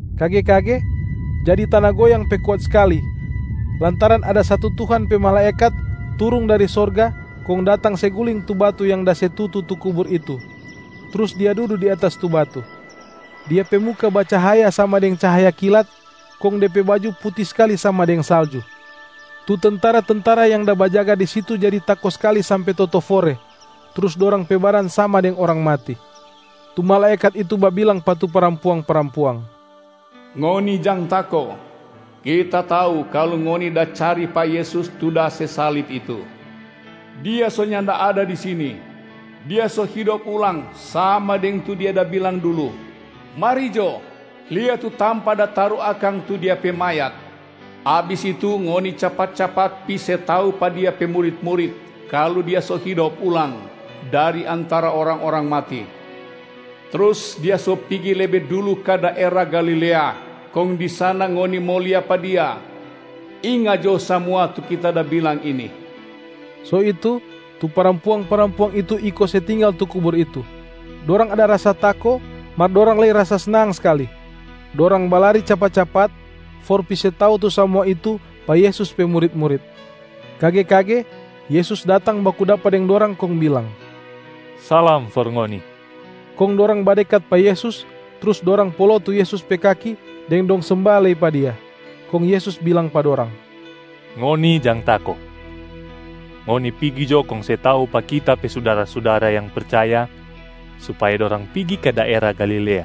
Kage-kage jadi tana goyang pe kuat skali lantaran ada satu Tuhan pe malaekat turung dari sorga kong datang se guling tu batu yang da se tutu tu kubur itu, trus dia dudu di atas tu batu. Dia pe muka bacahaya sama deng cahaya kilat, kong de pe baju puti skali sama deng salju. Tu tentara-tentara yang da bajaga di situ jadi tako skali sampe totofore, trus dorang pe badan sama deng orang mati. Tu malaekat itu babilang pa tu parampuang-parampuang, “Ngoni jang tako! Kita tau kalu ngoni da cari pa Yesus tu da se salib itu. Dia so nyanda ada di sini, Dia so hidop ulang sama deng tu Dia da bilang dulu. Mari jo, lia tu tampa da taru akang tu Dia pe mayat. Abis itu ngoni capat-capat pi se tau pa Dia pe murit-murit kalu Dia so hidop ulang dari antara orang-orang mati, trus Dia so pigi lebe dulu ka daera Galilea kong di sana ngoni mo lia pa Dia. Inga jo samua tu kita da bilang ini!” So itu, tu parampuang-parampuang itu iko se tinggal tu kubur itu. Dorang ada rasa tako mar dorang lei rasa snang skali. Dorang balari capat-capat for pi se tau tu samua itu pa Yesus pe murit-murit. Kage-kage Yesus datang baku dapa deng dorang kong bilang, “Salam for ngoni”. Kong dorang badekat pa Yesus trus dorang polo tu Yesus pe kaki deng dong semba lei pa Dia. Kong Yesus bilang pa dorang, “Ngoni jang tako. Ngoni pigi jo kong se tau pa Kita pe sudara-sudara yang percaya supaya dorang pigi ka daera Galilea,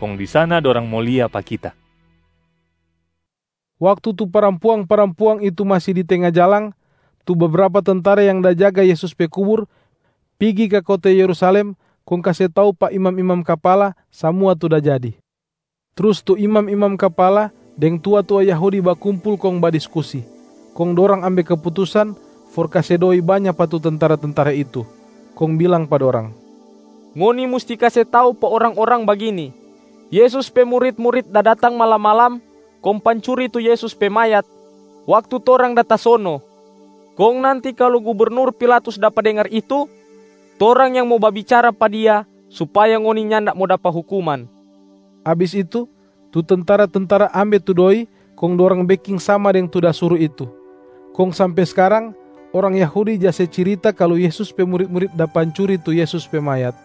kong di sana dorang mo lia pa Kita.” Waktu tu parampuang-parampuang itu masi di tenga jalang, tu bebrapa tentara yang da jaga Yesus pe kubur pigi ka kota Yerusalem kong kase tau pa imam-imam kapala samua tu da jadi. Trus tu imam-imam kapala deng tua-tua Yahudi bakumpul kong badiskusi, kong dorang ambe keputusan for kase doi banya pa tu tentara-tentara itu, kong bilang pa dorang, “Ngoni musti kase tau pa orang-orang bagini, ‘Yesus pe murit-murit da datang malam-malam kong pancuri tu Yesus pe mayat waktu torang da tasono.’ Kong nanti kalu gubernur Pilatus dapa dengar itu, torang yang mo babicara pa dia supaya ngoni nyanda mo dapa hukuman.” Abis itu, tu tentara-tentara ambe tu doi kong dorang beking sama deng tu da suru itu. Kong sampe skarang orang Yahudi ja se cirita kalu Yesus pe murit-murit da pancuri tu Yesus pe mayat.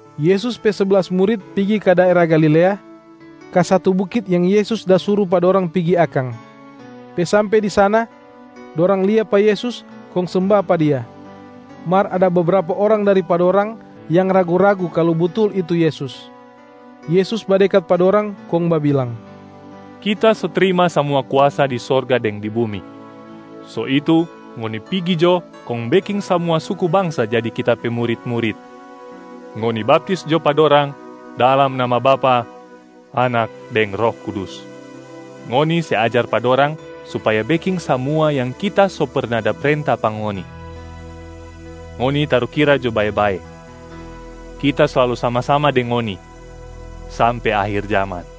Yesus pe seblas murit pigi ka daera Galilea, ka satu bukit yang Yesus da suru pa dorang pigi akang. Pe sampe di sana, dorang lia pa Yesus kong semba pa Dia, mar ada bebrapa orang dari pa dorang yang ragu-ragu kalu butul itu Yesus. Yesus badekat pa dorang kong babilang, “Kita so trima samua kuasa di sorga deng di bumi. So itu ngoni pigi jo kong beking samua suku bangsa jadi Kita pe murit-murit. Ngoni baptis jo pa dorang dalam nama Bapa, Anak deng Roh Kudus. Ngoni se ajar pa dorang supaya beking samua yang Kita so perna da prenta pa ngoni. Ngoni tarukira jo bae-bae, Kita slalu sama-sama deng ngoni sampe akhir jaman.”